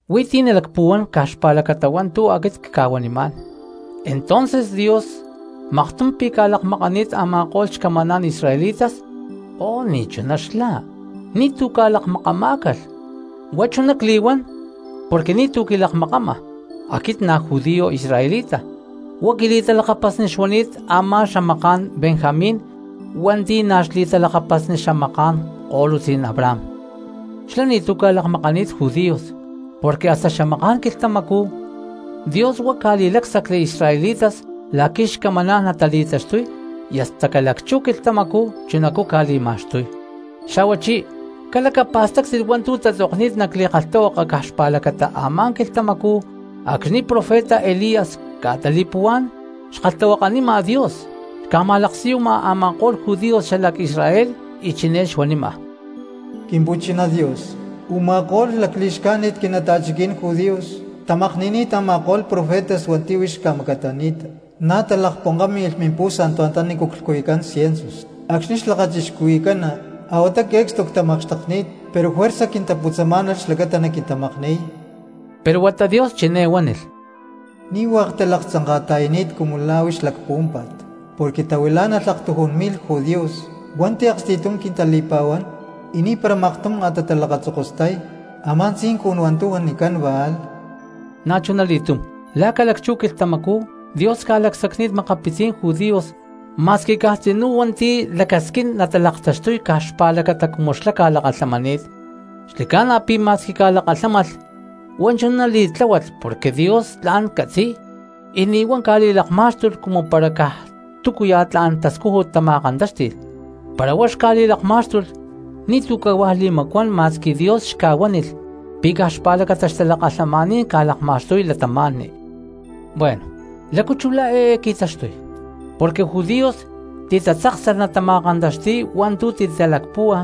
Huí ti̠ tla̠n nalacpuhuán caj xpa̠lacata hua̠ntu̠ aquit cca̠huanimá̠n: ¿Entonces Dios maktum pi̠ ca̠lakmakani̠t a̠ma̠ko̠lh xcamaná̠n israelitas? ¡Oh, ni̠chuná xlá, ni̠tu̠ ca̠lakmakamá̠calh! Huá chuná cli̠huán porque ni̠tu̠ quilakmakama aquit na̠ judío israelita, huá quili̠talakapasni xuani̠t a̠má xamaká̠n Benjamín hua̠nti̠ na̠ xli̠talakapasni xamaká̠n ko̠lutzí̠n Abraham. Xlá ni̠tu̠ ca̠lakmakani̠t judíos, porque hasta xamaká̠n quilhtamacú Dios huá ca̠li̠lácsacli israelitas la̠qui̠ xcamaná̠n natali̠taxtuy y hasta ca̠lacchú quilhtamacú chunacú ca̠li̠ma̠xtuy. Xa̠huachí calacapa̠stáctit hua̠ntu̠ tatzokni̠t nac li̠kalhtahuaka caj xpa̠lacata a̠má quilhtamacú acxni̠ profeta Elías ca̠tali̠puhuá̠n xkalhtahuakanima Dios xca̠ma̠laksiyuma a̠ma̠ko̠lh judíos xalac Israel y chiné xuanima: “Quimpu̠chiná Dios, u̠ma̠ko̠lh lacli̠xcájnit quinata̠chiquí̠n judíos tamakni̠ni̠t a̠ma̠ko̠lh profetas hua̠nti̠ huix xca̠macatani̠ta, na̠ talakponkámi̠lh mialtar anta nícu clhcuyucán ciensus acxni̠ xlakachixcuhui̠cána; a̠huata que̠cstu ctamakxtekni̠t, pero juerza quintaputzasta̠lamá̠nalh xlacata naquintamakni̠y.” Pero huata Dios chiné huánilh: “Ni̠ hua̠k talaktzanka̠ta̠yani̠t cumu la̠ huix lacpuhuámpa̠t, porque tahuilá̠nalh aktujún mi̠lh judíos hua̠nti̠ aksti̠tum quintali̠pa̠huán y ni̠para maktum a̠ talakatatzokostay a̠má tzincun hua̠ntu̠ huanicán Baal.” Na̠chunali̠tum la̠ ca̠lacchú quilhtamacú, Dios ca̠lacsacni̠t makapitzí̠n judíos ma̠squi caj tzinú hua̠nti̠ lacasquín natalaktaxtuy caj xpa̠lacata cumu xlá ca̠lakalhamani̠t. Xli̠ca̠na pi̠ ma̠squi ca̠lakalhámalh huá chuná li̠tláhualh porque Dios tla̠n catzi̠y, y ni̠ huá ca̠li̠lakmá̠xtulh cumu para caj túcuya̠ tla̠n tascújut tama̠kantáxti̠lh; para huá xca̠li̠lakmá̠xtulh ni̠tu̠ cahuá li̠macuán ma̠squi Dios xca̠huánilh pi̠ caj xpa̠lacata xtalakalhamaní̠n ca̠lakma̠xtuy cristianos. Bueno, ¿lácu chú la̠ eé qui̠taxtuy? Porque judíos titatzáksalh natama̠kantaxti̠y hua̠ntu̠ titalacpúhua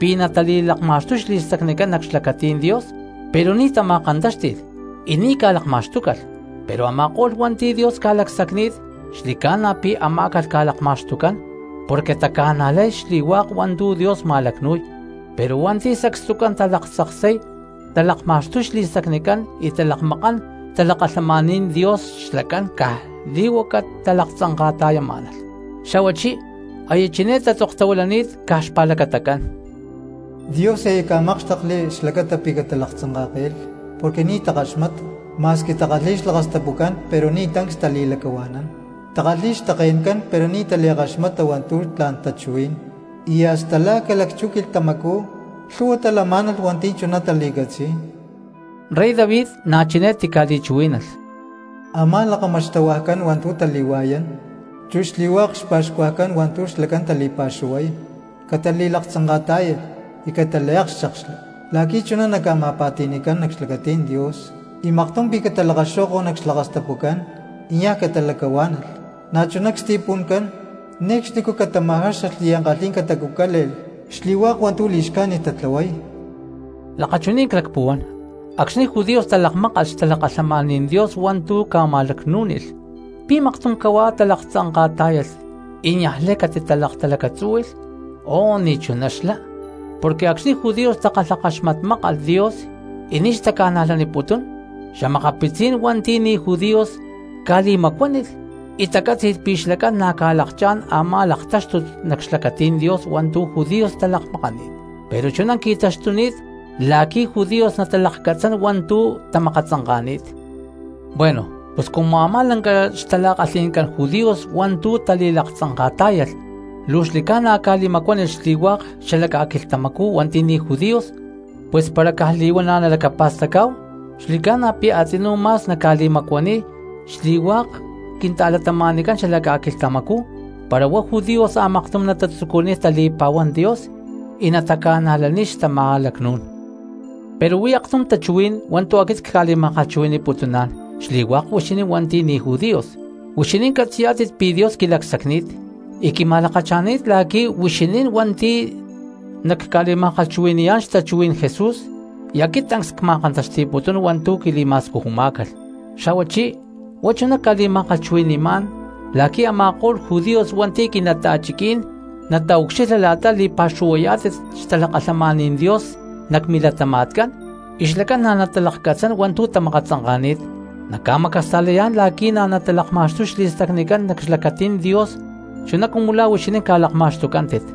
pi̠ natali̠lakma̠xtuy xli̠stacnicán nac xlacatí̠n Dios, pero ni̠ tama̠kantáxti̠lh y ni̠ ca̠lakma̠xtúcalh. Pero a̠ma̠ko̠lh hua̠nti̠ Dios ca̠lacsacni̠t xli̠ca̠na pi̠ amá̠calh ca̠lakma̠xtucán porque taca̠najlay xli̠hua̠k hua̠ntu̠ Dios ma̠lacnu̠y. Pero hua̠nti̠ sacstucán talaktzaksay talakma̠xtuy xli̠stacnicán y talakmakán xtalakalhamaní̠n Dios xlacán caj li̠huaca talaktzanka̠ta̠yamá̠nalh. Xa̠huachí aya chiné tatzoktahuilani̠t caj xpa̠lacatacán: “Dios aya ca̠mákxtekli xlacata pí catalaktzanka̠ke̠lh porque ni̠ takaxmata, ma̠squi takalhi̠y xlakastapucán pero ni̠ tancs tali̠lacahua̠nán, takalhi̠y xtake̠ncán pero ni̠ tali̠kaxmata hua̠ntu̠ tla̠n tachuhuí̠n, y hasta la̠ ca̠lacchú quilhtamacú lhu̠hua talamá̠nalh hua̠nti̠ chuná tali̠catzi̠y.” Rey David na̠ chiné tica̠li̠chuhuí̠nalh: Amá la̠ kama xtahuajcán hua̠ntu̠ tali̠hua̠yán chu xli̠hua̠k xpa̠xcuajcán hua̠ntu̠ xlacán tali̠pa̠xuhuay, catali̠laktzanka̠tá̠yalh y cataliakchékxli, la̠qui̠ chuná naca̠ma̠pa̠ti̠ni̠cán nac xlacatí̠n Dios. Y maktum pi̠ catalakaxó̠ko̠lh nac xlakastapucán y niaj catalacahuá̠nalh, na̠chuná csti̠pu̠ncán, ne̠cxnicú catama̠jáxalh y ankalhí̠n catacucále̠lh xli̠hua̠k hua̠ntu̠ li̠xcájnit tatlahuay. Lakachuní̠n clacpuhuán: Acxni̠ judíos talakmákalh xtalakalhamaní̠n Dios hua̠ntu̠ ca̠ma̠lacnú̠nilh, ¿pi̠ maktum cahuá talaktzanka̠tá̠yalh y niaj lay catitalaktalacatzúhui̠lh? ¡Oh, ni̠chuná xlá! Porque acxni̠ Judíos takalhakaxmatmákalh Dios y ni̠ xtaca̠najlaniputún, xa̠makapitzí̠n cristianos hua̠nti̠ ni̠ judíos ca̠li̠macuánilh y tacátzi̠lh pi̠ xlacán na̠ ca̠lakchá̠n a̠má laktáxtut nac xlacatí̠n Dios hua̠ntu̠ judíos talakmakaní̠t; pero chuná qui̠taxtuni̠t la̠qui̠ judíos natalakcatzán hua̠ntu̠ tamakatzanka̠ni̠t. Bueno, pus cumu a̠má lanca xtala̠kalhi̠ncán judíos hua̠ntu̠ tali̠laktzanka̠tá̠yalh luu xli̠ca̠na ca̠li̠macuánilh xli̠hua̠k cristianos xala ca̠quilhtamacú hua̠nti̠ ni̠ judíos, pus para caj li̠huana̠ nalacapa̠stacá̠hu xli̠ca̠na pi̠ a̠tzinú ma̠s naca̠li̠macuaniy xli̠hua̠k cristianos xalac ca̠quilhtamacú para huá judíos a̠maktum natatzucuniy tali̠pa̠huán Dios y nataca̠najlaniy xtama̠lacnú̠n. Pero huí aktum tachuhuí̠n hua̠ntu̠ aquit cca̠li̠ma̠kalhchuhui̠ni̠putuná̠n xli̠hua̠k huixinín hua̠nti̠ ni̠ judíos. Huixinín catzi̠yá̠tit pi̠ Dios quilacsacni̠t y quima̠lakacha̠ni̠t la̠qui̠ luu huixinín hua̠nti̠ nacca̠li̠ma̠kalhchuhui̠ni̠yá̠n xtachuhuí̠n Jesús, y aquit tancs cma̠kantaxti̠putún hua̠ntu̠ quili̠ma̠scujumá̠calh. Xa̠huachí huá chuná cca̠li̠ma̠kalhchuhui̠ni̠má̠n la̠qui̠ a̠ma̠ko̠lh judíos hua̠nti̠ quinata̠chiquí̠n nataucxilha la̠ta li̠pa̠xuhuayá̠tit xtalakalhamaní̠n Dios nac milatama̠tcán y xlacán na̠ natalakcatzán hua̠ntu̠ tamakatzanka̠ni̠t, naca̠macasta̠layá̠n la̠qui̠ na̠ natalakma̠xtuy xli̠stacnicán nac xlacatí̠n Dios chuná cumu la̠ huixinín ca̠lakma̠xtucántit.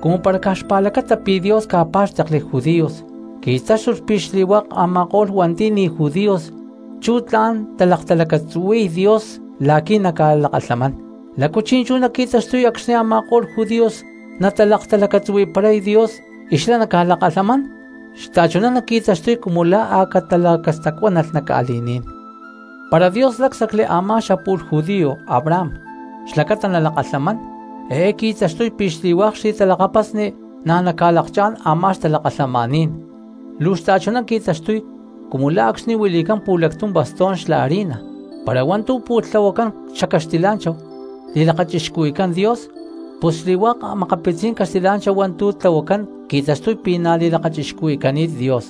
Cumu para caj xpa̠lacata pi̠ Dios ca̠pá̠xtekli judíos qui̠táxtulh pi̠ xli̠hua̠k a̠ma̠ko̠lh cristianos hua̠nti̠ ni̠ judíos chú tla̠n talaktalacatzuhui̠y Dios la̠qui̠ naca̠lakalhamán, ¿lácu chi̠nchú naqui̠taxtuy acxni̠ a̠ma̠ko̠lh judíos natalaktalacatzuhui̠paray Dios y xlá naca̠lakalhamán? ¡Xta̠chuná naqui̠taxtuy cumu la̠ a̠ catalacastacuánalh nac ca̠li̠ní̠n! Para Dios lácsacli a̠má xapu̠lh judío Abraham xlacata nalakalhamán, eé qui̠taxtuy pi̠ xli̠hua̠k xli̠talakapasni na̠ naca̠lakchá̠n a̠má xtalakalhamaní̠n. Luu xta̠chuná qui̠taxtuy cumu la̠ acxni̠ huili̠cán pu̠lactum bastón xla harina, para hua̠ntu̠ pu̠lh tlahuacán xacaxtila̠nchahu li̠lakachixcuhui̠cán Dios, pus xli̠hua̠k a̠makapitzí̠n caxtilá̠nchahu hua̠ntu̠ tlahuacán qui̠taxtuy pi̠ na̠ li̠lakachixcuhui̠cani̠t Dios;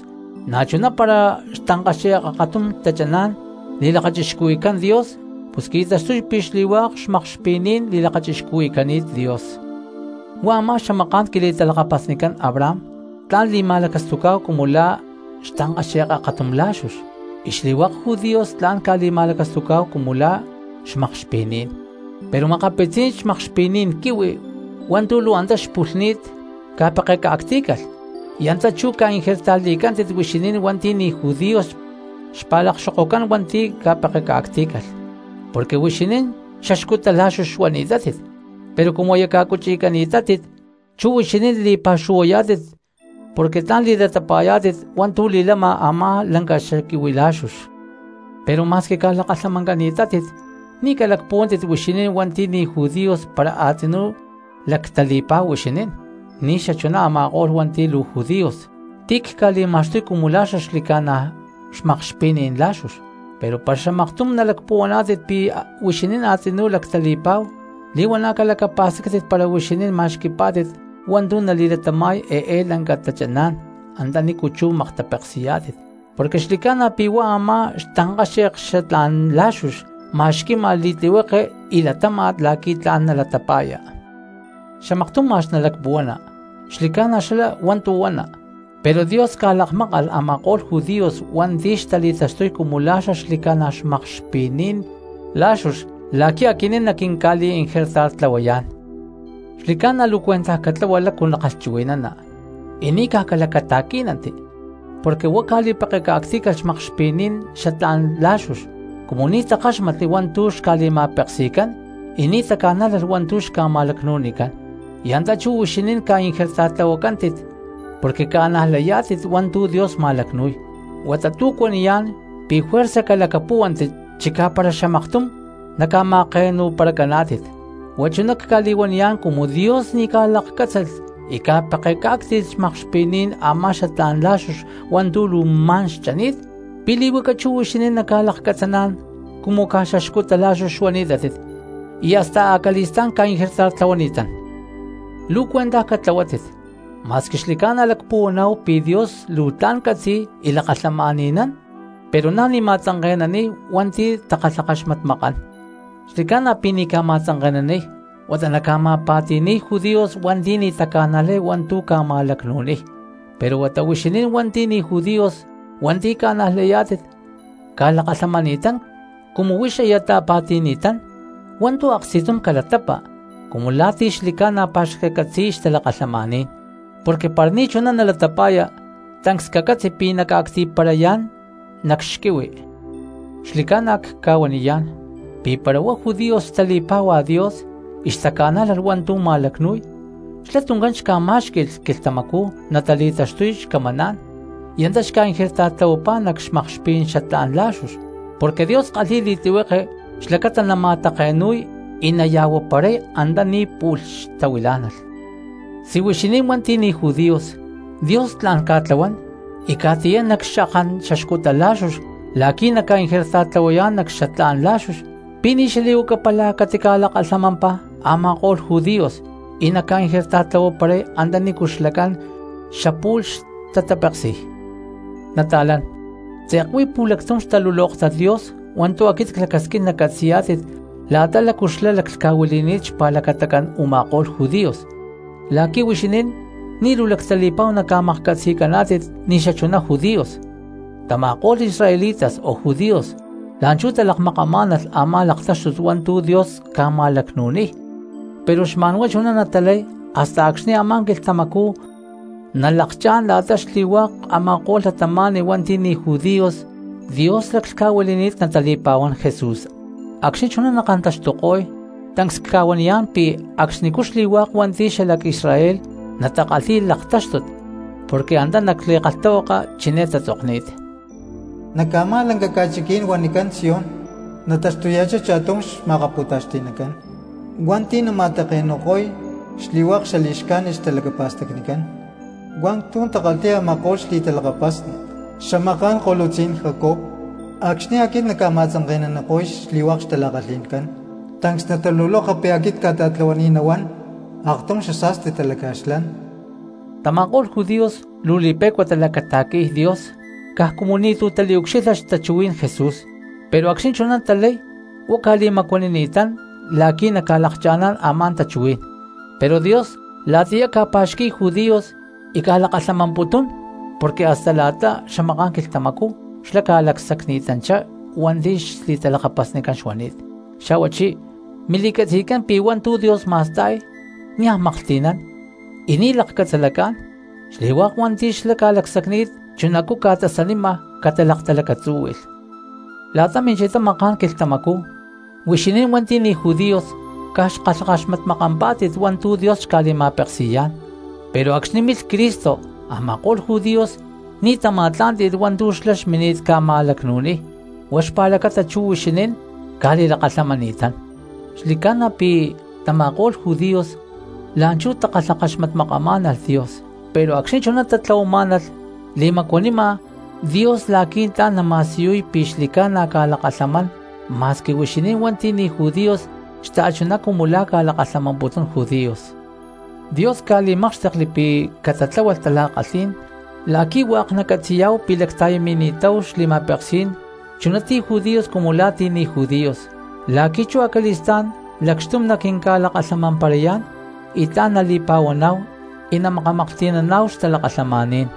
na̠chuná para xtankáxe̠k akatum tachaná̠n li̠lakachixcuhui̠cani̠t Dios, pus qui̠taxtuy pi̠ xli̠hua̠k xmakxpi̠ní̠n li̠lakachixcuhui̠cani̠t Dios. Huá a̠má xamaká̠n quili̠talakapasnicán Abraham tla̠n li̠ma̠lacastucá̠hu cumu la̠ xtankaxe̠k akatum lá̠xux y xli̠hua̠k judíos tla̠n ca̠li̠ma̠lacastucá̠hu cumu la̠ xmakxpi̠ní̠n. Pero makapitzí̠n xmakxpi̠ní̠n quihui hua̠ntu̠ luu antá xpulhni̠t ca̠pekeca̠ctí̠calh, y antá chú ca̠ingertarli̠cántit huixinín hua̠nti̠ ni̠ judíos xpa̠lakxokocán hua̠ntu̠ ca̠pekeca̠ctí̠calh. Porque huixinín xaxcuta lá̠xux xuani̠tátit, pero cumu aya ca̠cuchi̠cani̠tátit chú huixinín li̠pa̠xuhuayá̠tit porque tla̠n li̠latapa̠yá̠tit hua̠ntu̠ li̠lama a̠má lanca xaquihui lá̠xux. Pero ma̠squi ca̠lakalhamancani̠tátit ni̠ calacpuhuántit huixinín hua̠nti̠ ni̠ judíos para a̠tzinú lacuán cristianos huixinín ni̠xachuná a̠ma̠ko̠lh hua̠nti̠ luu judíos ti̠ cca̠li̠ma̠xtuy cumu la̠ xlica̠na̠ xmakxpi̠ní̠n lá̠xux. Pero para xamaktum nalacpuhuaná̠tit pi̠ huixinín a̠tzinú lactali̠pa̠hu, li̠huana̠ calacapa̠stáctit para huixinín ma̠xqui̠pá̠tit hua̠ntu̠ nali̠latama̠y eé lanca tachaná̠n antanícu chú maktapeksi̠ya, porque xli̠ca̠na pi̠ huá a̠má xtankáxe̠k xatlá̠n la̠xux ma̠xqui̠má̠n li̠tlihueke y latáma̠t la̠qui̠ tla̠n nalatapa̠ya. Pero xamaktum ma̠x nalacpuhuana: “Xli̠ca̠na xlá hua̠ntu̠ huana, pero Dios ca̠lakmákalh a̠ma̠ko̠lh judíos hua̠nti̠ xtali̠taxtuy cumu la̠ xaxli̠ca̠na xmakxpi̠ní̠n lá̠xux la̠qui̠ aquinín naquinca̠li̠inger tartlahuayá̠n.” Xli̠ca̠na luu cuentaj catlahua lácu nakalhchuhui̠nana y ni̠ caj calacata̠quí̠nanti, porque huá ca̠li̠pekeca̠ctí̠calh xmakxpi̠ní̠n xatlá̠n lá̠xux cumu ni̠ takáxmatli hua̠ntu̠ xca̠li̠ma̠peksi̠cán y ni̠ taca̠nájlalh hua̠ntu̠ xca̠ma̠lacnu̠nicán; y antá chú huixinín ca̠ingertartlahuacántit porque ca̠najlayá̠tit hua̠ntu̠ Dios ma̠lacnu̠y, huata tu̠ cuaniyá̠n pi̠ juerza calacapuhuani chicá para xamaktum naca̠ma̠take̠nu̠paracaná̠tit. Huá chuná cca̠li̠huaniyá̠n, cumu Dios ni̠ ca̠lakcátzalh y ca̠pekecá̠cti̠lh xmakxpi̠ní̠n a̠má xatlá̠n lá̠xux hua̠ntu̠ luu ma̠n xchani̠t, ¿pi̠ li̠huaca chú huixinín naca̠lakcatzaná̠n cumu caj xaxcuta lá̠xux xuani̠tátit y hasta acali̠stá̠n ca̠ingertartlahuani̠tán? Xli̠ca̠na luu cuentaj catlahuátit, ma̠squi xli̠ca̠na lacpuhuaná̠hu pi̠ Dios luu tla̠n catzi̠y y lakalhamán cristianos, pero na̠ ni̠ ma̠tzanke̠naniy hua̠nti̠ takalhakaxmatmakán. Porque xli̠ca̠na pi̠ ni̠ ca̠ma̠tzanke̠naniy huata naca̠ma̠pa̠ti̠ni̠y judíos hua̠nti̠ ni̠ taca̠najlay hua̠ntu̠ ca̠ma̠lacnu̠niy, pero huata huixinín hua̠nti̠ ni̠ judíos y hua̠nti̠ ca̠najlayá̠tit ca̠lakalhamani̠tán. Cumu huix aya ta̠pa̠ti̠ni̠tán, hua̠ntu̠ aksti̠tum calatapa cumu la̠ ti̠ xli̠ca̠na pa̠xcatcatzi̠niy xtalakalhamaní̠n, porque para ni̠chuná nalatapa̠ya tancs cacatzi pi̠ naca̠cti̠parayá̠n nac xquihui. Xli̠ca̠na cca̠huaniyá̠n, pi̠ para huá judíos xtali̠pá̠hua Dios y xtaca̠nájlalh hua̠ntu̠ ma̠lacnu̠y xlá tuncán xca̠má̠xqui̠lh quilhtamacú natali̠taxtuy xcamaná̠n y antá xca̠ingertartlahuapá nac xmakxpí̠n xatlá̠n lá̠xux; porque Dios kalhi̠y li̠tlihueke xlacata nama̠take̠nu̠y y naya̠huaparay antaní pu̠lh xtahuilá̠nalh. Si huixinín hua̠nti̠ ni̠ judíos Dios tla̠n ca̠tlahuán y ca̠qui̠tiyán nac xakán xaxcuta lá̠xux la̠qui̠ naca̠ingertartlahuayá̠n nac xatlá̠n lá̠xux, ¿pi̠ ni̠ xali̠huaca pála catica̠lakalhamampá a̠ma̠ko̠lh judíos y naca̠ingertartlahuaparay antanícu xlacán xapu̠lh xli̠ca̠na xtatapeksi̠y? Nata̠lán, tze̠k huí pu̠lactum xtalulóktat Dios hua̠ntu̠ aquit clacasquín nacatzi̠yá̠tit la̠ta lácu xlá laclhca̠huili̠ni̠t xpa̠lacatacán u̠ma̠ko̠lh judío, la̠qui̠ huixinín ni̠ luu lactali̠pa̠hu naca̠maklhcatzi̠caná̠tit ni̠xachuná judíos. Tama̠ko̠lh israelitas o judíos la̠nchú talakmakamá̠nalh a̠má laktáxtut hua̠ntu̠ Dios ca̠ma̠lacnu̠niy, pero xma̠n huá chuná natalay hasta acxni̠ a̠má quilhtamacú nalakchá̠n la̠ta xli̠hua̠k a̠ma̠ko̠lh cristianos hua̠nti̠ ni̠ judíos hua̠nti̠ Dios laclhca̠huili̠ni̠t natali̠pa̠huán Jesús. Acxni̠ chuná nakantaxtuko̠y, tancs cca̠huaniyá̠n pi̠ acxnicú xli̠hua̠k hua̠nti̠ xalac Israel natakalhi̠y laktáxtut, porque antá nac li̠kalhtahuaka chiné tatzokni̠t: Nac a̠má lanca ca̠chiquí̠n huanicán Sión nataxtuya̠chá cha̠tum xma̠kapu̠taxti̠nacán hua̠nti̠ nama̠take̠nu̠ko̠y xli̠hua̠k xali̠xcájnit xtalacapa̠stacnicán hua̠ntu̠ takalhi̠y a̠ma̠ko̠lh xli̠talakapasni xamaká̠n ko̠lutzí̠n Jacob. Acxni̠ aquit nacca̠ma̠tzanke̠naniko̠y xli̠hua̠k xtala̠kalhi̠ncán, tancs nataluloka pi̠ aquit cca̠ta̠tlahuani̠t nahuán aktum xasa̠sti talaca̠xlán. Tama̠ko̠lh judíos luu li̠pe̠cua talacata̠qui̠y Dios caj cumu ni̠tu̠ taliucxilha xtachuhuí̠n Jesús, pero acxni̠ chuná talay huá ca̠li̠macuanini̠tán la̠qui̠ naca̠lakcha̠ná̠n a̠má tachuhuí̠n; pero Dios la̠tiyá ca̠pa̠xqui̠y judíos y ca̠lakalhamamputún porque hasta la̠ta xamaká̠n quilhtamacú xlá xca̠lacsacni̠tanchá hua̠nti̠ xli̠talakapasnicán xuani̠t. Xa̠huachí mili̠catzi̠tcán pi̠ hua̠ntu̠ Dios ma̠sta̠y niaj maklhti̠nán y ni̠ lakcatzalacá̠n, y xli̠hua̠k hua̠nti̠ xlá ca̠lacsacni̠t chunacú ca̠tasanima catalaktalacatzúhui̠lh. La̠ta minchitá maká̠n quilhtamacú huixinín hua̠nti̠ ni̠ judíos caj xkalhakaxpatmakampá̠tit hua̠ntu̠ Dios xca̠li̠ma̠peksi̠yá̠n, pero acxni̠ milh Cristo a̠ma̠ko̠lh judíos ni̠ tama̠tlá̠nti̠lh hua̠ntu̠ xlá xmini̠t ca̠ma̠lacnu̠niy, huá xpa̠lacata chú huixinín ca̠li̠lakalhamani̠tán. Xli̠ca̠na pi̠ tama̠ko̠lh judíos la̠nchú takalhakaxmatmakamá̠nalh Dios pero acxni̠ chuná tatlahuamá̠nalh li̠macuanima Dios la̠qui̠ tla̠n nama̠siyuy pi̠ xli̠ca̠na ca̠lakalhamán ma̠squi huixinín hua̠nti̠ ni̠ judíos xta̠chuná cumu la̠ ca̠lakalhamamputún judíos. Dios ca̠li̠mákxtekli pi̠ catatláhualh tala̠kalhí̠n la̠qui̠ xli̠hua̠k cristianos nacatzi̠yá̠hu pi̠ lacta̠yamakanini̠táhu xli̠ma̠peksí̠n chuná ti̠ judíos cumu la̠ ti̠ ni̠ judíos, la̠qui̠ chú acali̠stá̠n lacxtum naquinca̠lakalhamamparayá̠n y tla̠n nali̠pa̠huaná̠hu y namakamaklhti̠naná̠hu xtalakalhamaní̠n.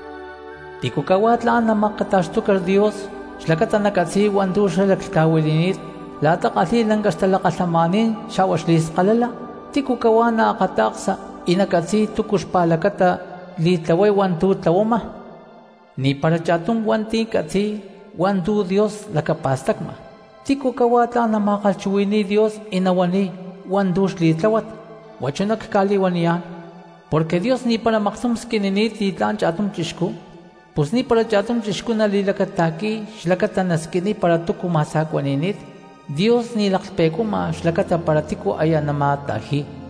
¿Tícu cahuá tla̠n namacata̠xtuca Dios xlacata nacatzi̠y hua̠ntu̠ xlá laclhca̠huili̠ni̠t la̠ta kalhi̠y lanca xtalakalhamaní̠n xa̠hua xli̠skalala? ¿Tícu cahuá naakata̠ksa y nacatzi̠y túcu xpa̠lacata li̠tlahuay hua̠ntu̠ tlahuama? Ni̠para cha̠tum cristiano catzi̠y hua̠ntu̠ Dios lacapa̠stacma. ¿Tícu cahuá tla̠n nama̠kalhchuhui̠ni̠y Dios y nahuaniy hua̠ntu̠ xli̠tláhuat? Huá chuná cli̠huaniyá̠n porque Dios ni̠para maktum squinini̠t li̠tlá̠n cha̠tum chixcú, pus ni̠para cha̠tum chixcú nali̠lacata̠qui̠y xlacata nasquiniy para túcu ma̠sa̠cuani̠ni̠t, Dios ni̠ laklhpe̠cuama xlacata para tícu aya nama̠ta̠ji̠y.